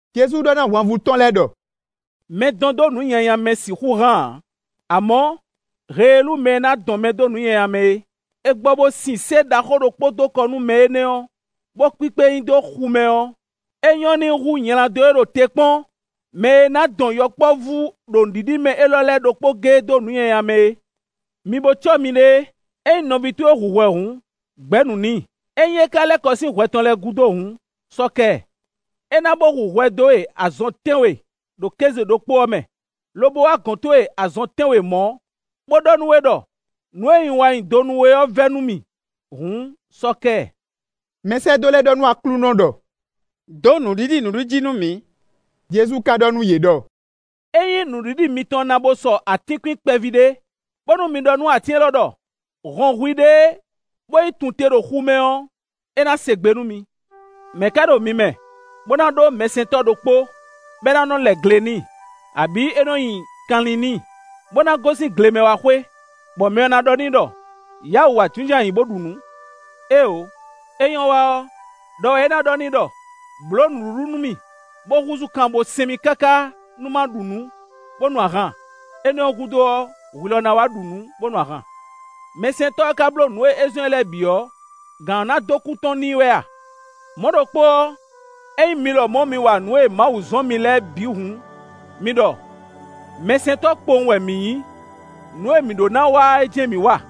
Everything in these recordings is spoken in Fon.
Jezu ɖɔ nú ahwanvú tɔn lɛ́ɛ ɖɔ: “Mɛ dɔn dó nǔ nyanya mɛ sixú hán ǎ; amɔ̌, heelú mɛ e ná dɔn mɛ dó nǔ nyanya mɛ é; è gbɔ bó sin sé ɖaxó ɖokpó dó kɔ nú mɛ énɛ́ ɔ́, bó kpíkpé e nyi xu mɛ ɔ́, é nyɔ́ n'i hú nyladó e ɖo te kpɔ́n mɛ e na dɔn yɔkpɔ́vú ɖo nǔɖiɖi mɛ élɔ́ lɛ́ɛ ɖokpó géé dó nǔ nyanya mɛ é. Mi bo cɔ́ miɖée! “Ényí nɔví towe hu hwɛ hǔn, gbɛ̌ nǔ n'i; ényí é ka lɛ́ kɔ sín hwɛ tɔn lɛ́ɛ gúdo hǔn, sɔ́ kɛ ɛ. É na bó hu hwɛ dó we azɔn tɛ́nwe ɖo kéze ɖokpó ɔ́ mɛ, lobo wá gɔ̌n towe azɔn tɛ́nwe mɔ̌, bó ɖɔ nú we ɖɔ: ‘Nǔ e un wa nyi do nú we ɔ́ vɛ́ nú mì’ hǔn, sɔ́ kɛ ɛ.” Mɛsɛ́dó lɛ́ɛ ɖɔ nú Aklúnɔ ɖɔ: “Dǒ nǔɖiɖi nǔɖiɖi jí nú mǐ.” Jezu ka ɖɔ nú yě ɖɔ: “Ényí nǔɖiɖi mitɔn na bo sɔ atínkwín kpɛví ɖé, bónú mi ɖɔ nú atín élɔ́ ɖɔ: ‘Hɔn hwiɖée bó yi tun te ɖo xu mɛ’ ɔ́, é ná se gbe nú mi.” “Mɛ̌ ká ɖo mi mɛ, bó ná ɖó mɛsɛntɔ́ ɖokpó, bɔ é nɔ́ lɛ gle n'i, abǐ é nɔ́ nyi kanlin n'i, bó ná gosín gle mɛ wá xwé, bɔ mɛ ɔ́ ná ɖɔ n'i ɖɔ: ‘Yǎ wǔ wá jínjɔ́n ayǐ bó ɖu nǔ?’ Éeǒ; é nyɔ́ wa ɔ́, ɖɔ wɛ é ná ɖɔ n'i ɖɔ: ‘Blǒ nǔɖuɖu nú mì, bó húzú kan bó sɛn mì káká nú ma ɖu nǔ, bó nu ahan; énɛ́ ɔ́ gúdo ɔ́, hwi lɔ ná wá ɖu nǔ, bó nu ahan.’ Mɛsɛntɔ́ ɔ́ ka bló nǔ e é zɔ́n ɛ lɛ́ɛ bǐ ɔ́, gǎn ɔ́ ná dó kú tɔn n'i wɛ a? Mɔ̌ ɖokpó ɔ́, ényí mi lɔmɔ̌ mi wa nǔ e Mawu zɔ́n mi lɛ́ɛ bǐ hǔn, mi ɖɔ: ‘Mɛsɛntɔ́ kpowun wɛ mǐ nyí; nǔ e mǐ ɖó ná wa é jɛ́n mǐ wa.’”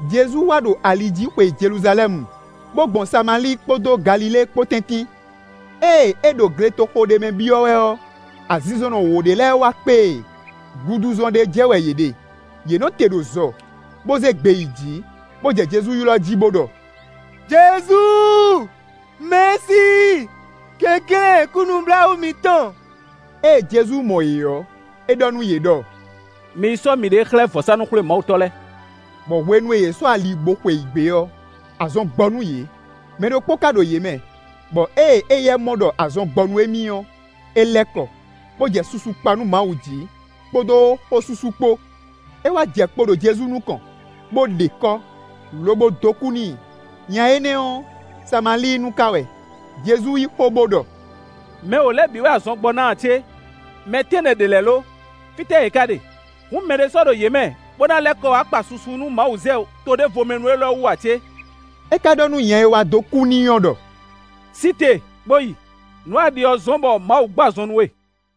Jezu wá ɖo ali jí xwe Jeluzalɛ́mu, bó gbɔn Samalíi kpódó Galilée kpó tɛ́ntin. Ée é ɖo gletoxo ɖé mɛ byɔ́ wɛ ɔ́, azinzɔnnɔ wǒ ɖé lɛ́ɛ wá kpé e; guduzɔn ɖé jɛ wɛ yě ɖe. Yě nɔ te ɖo zɔ, bó zé gbe yi jǐ, bó jɛ Jezu ylɔ́ jí, bó ɖɔ: “Jezu, Mɛ̌si, kɛnklɛ́n kú nǔbláwǔ mǐtɔn.” Ée Jezu mɔ yě ɔ́, é ɖɔ nú yě ɖɔ: “Mi yi sɔ́ miɖée xlɛ́ vɔ̌sánú-xwlémawutɔ́ lɛ́ɛ;” bɔ hwenu e yě sɔ́ ali bó xweyǐgbe ɔ́, azɔn gbɔ nú yě. Mɛ ɖokpó ka ɖo yě mɛ, bɔ ée éyɛ́ mɔ ɖɔ azɔn gbɔ nú émí ɔ́, é lɛ́ kɔ, bó jɛ susu kpa nú Mawu jí, kpódó xósúsú kpó. É wá jɛ kpo ɖo Jezu nukɔn, bó ɖe kɔ́, lobo dó kú n'i. Nya énɛ́ ɔ́, Samalíinu ka wɛ. Jezu yí xó, bó ɖɔ: “Mɛ wǒ lɛ́ɛ bǐ wɛ azɔn gbɔ ná ǎ cé? Mɛ tɛ́nnɛ ɖě lɛ́ɛ lo? Fítɛ́ yě ká ɖe? Hǔn mɛɖé sɔ́ ɖo yě mɛ, bó ná lɛ́ kɔ wá kpa susu nú Mawu zɛ toɖévomɛnu élɔ́ wú ǎ cé?” É ka ɖɔ nú nya e wá dó kú n'i ɔ́ ɖɔ: “Sí te, bó yi; nǔ e a ɖi ɔ́ zɔ́n bɔ Mawu gbɔ azɔn nú we.”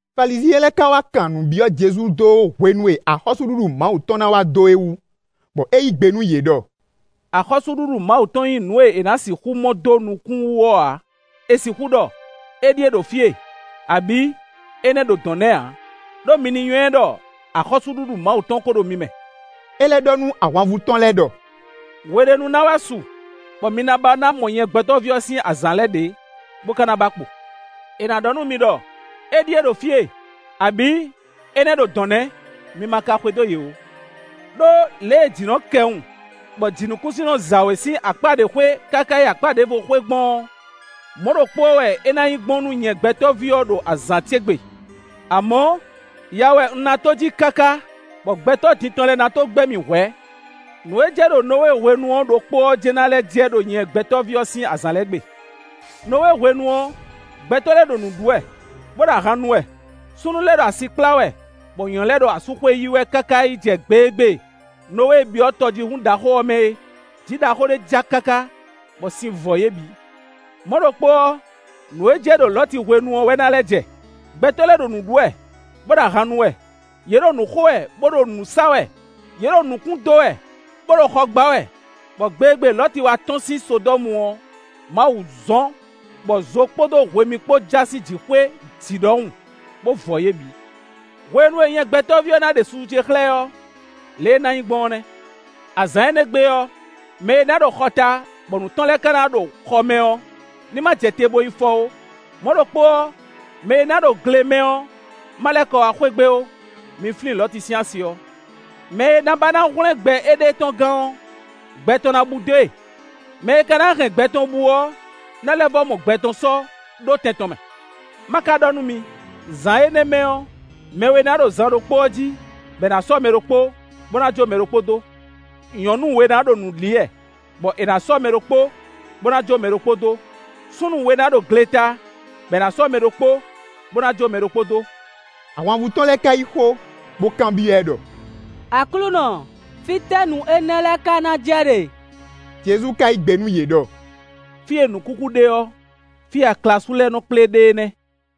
Falizyɛn lɛ́ɛ ka wá kan nǔ byɔ́ Jezu dó hwenu e axɔ́súɖuɖu Mawu tɔn na wa dó é wu, bɔ é yí gbe nú yě ɖɔ: “Axɔ́súɖuɖu Mawu tɔn nyí nǔ e è nǎ sixú mɔ dó nukún wú ɔ́ ǎ. È sixú ɖɔ: ‘Éɖíe ɖo fí e; abǐ énɛ́ ɖo dɔ̌n nɛ́’ ǎ. Đó mi ní nywɛ́ ɖɔ axɔ́súɖuɖu Mawu tɔn ko ɖo mi mɛ.” É lɛ́ ɖɔ nú ahwanvú tɔn lɛ́ɛ ɖɔ: “Hwe ɖé nu ná wá su, bɔ mi na ba ná mɔ nyɛ Gbɛtɔ́ví ɔ́ sín azǎn lɛ́ɛ ɖě, bó ka na ba kpo. È nǎ ɖɔ nú mi ɖɔ: ‘Éɖíe ɖo fí e, abǐ énɛ́ ɖo dɔ̌n nɛ́!’ Mi ma ka xwedó yě ó. Đó, lě e jǐ nɔ́ kɛwun, bɔ jǐnukúnsin nɔ za wě sín akpá ɖě xwé, káká yi akpá ɖěvo xwé gbɔn ɔ́, mɔ̌ ɖokpó ɔ́ wɛ é ná nyí gbɔn nú nyɛ Gbɛtɔ́ví ɔ́ ɖo azǎn ce gbe. Amɔ̌, ya wɛ un ná tó jí káká, bɔ gbɛtɔ́ din tɔn lɛ́ɛ na tó gbɛ́ mì hwɛ̌. Nǔ e jɛ ɖo Nɔwée hwenu ɔ́ ɖokpó ɔ́ jɛ́n na lɛ́ jɛ ɖo nyɛ Gbɛtɔ́ví ɔ́ sín azǎn lɛ́ɛ gbe. Nɔwée hwenu ɔ́, gbɛtɔ́ lɛ́ɛ ɖo nǔ ɖu wɛ, bó ɖo ahan nu wɛ; súnnu lɛ́ɛ ɖo asi kplá wɛ, bɔ nyɔ̌nu lɛ́ɛ ɖo asúxwé yi wɛ káká yi jɛ gbe e gbe Nɔwée byɔ́ tɔjíhún ɖaxó ɔ́ mɛ é; jǐ ɖaxó ɖé ja káká, bɔ sin vɔ yě bǐ. Mɔ̌ ɖokpó ɔ́, nǔ e jɛ ɖo Lɔ̌ti hwenu ɔ́ wɛ na lɛ́ jɛ: gbɛtɔ́ lɛ́ɛ ɖo nǔ ɖu wɛ, bó ɖo ahan nu wɛ; yě ɖo nǔ xɔ wɛ, bó ɖo nǔ sa wɛ; yě ɖo nukún dó wɛ, bó ɖo xɔ gbá wɛ, bɔ gbe e gbe Lɔ̌ti wá tɔ́n sín Sodɔ́mu ɔ́, Mawu zɔ́n, bɔ zo kpódó hwemí kpó ja sín jǐxwé jǐ ɖɔhun, bó vɔ yě bǐ. Hwenu e nyɛ Gbɛtɔ́ví ɔ́ ná ɖe susu ce xlɛ́ ɔ́, lě e é ná nyí gbɔn ɔ́ nɛ́. “Azǎn énɛ́ gbe ɔ́, mɛ e ná ɖo xɔ ta bɔ nǔ tɔn lɛ́ɛ ka ná ɖo xɔ mɛ ɔ́, ní ma jɛ te bó yi fɔ ó. Mɔ̌ ɖokpó ɔ́, mɛ e ná ɖo gle mɛ ɔ́ má lɛ́ kɔ wá xwé gbe ó. Mi flín Lɔ̌ti sín asi ɔ́. Mɛ e ná ba ná hwlɛ́n gbɛ éɖée tɔn gán ɔ́, gbɛ tɔn ná bú dó e. Mɛ e ka ná hɛn gbɛ tɔn bú ɔ́ ná lɛ́ vɔ́ mɔ gbɛ tɔn sɔ́ ɖó tɛn tɔn mɛ. Má ka ɖɔ nú mi: zǎn énɛ́ mɛ ɔ́, mɛ we ná ɖo zan ɖokpó ɔ́ jí, bɔ è nǎ sɔ́ mɛ ɖokpó, bó ná jó mɛ ɖokpó dó. Nyɔ̌nu we ná ɖo nǔ li wɛ, bɔ è nǎ sɔ́ mɛ ɖokpó, bó ná jó mɛ ɖokpó dó. [ Súnnu we ná ɖo gleta, bɔ è nǎ sɔ́ mɛ ɖokpó, bó ná jó mɛ ɖokpó dó.”] Ahwanvú tɔn lɛ́ɛ ka yí xó, bó kanbyɔ́ ɛ ɖɔ: “Aklúnɔ! Fítɛ́ nǔ énɛ́ lɛ́ɛ ka ná jɛ ɖe?” Jezu ka yí gbe nú yě ɖɔ: “Fí e nǔ kúkú ɖe ɔ́, fí e aklasú lɛ́ɛ nɔ kplé ɖe é nɛ́.”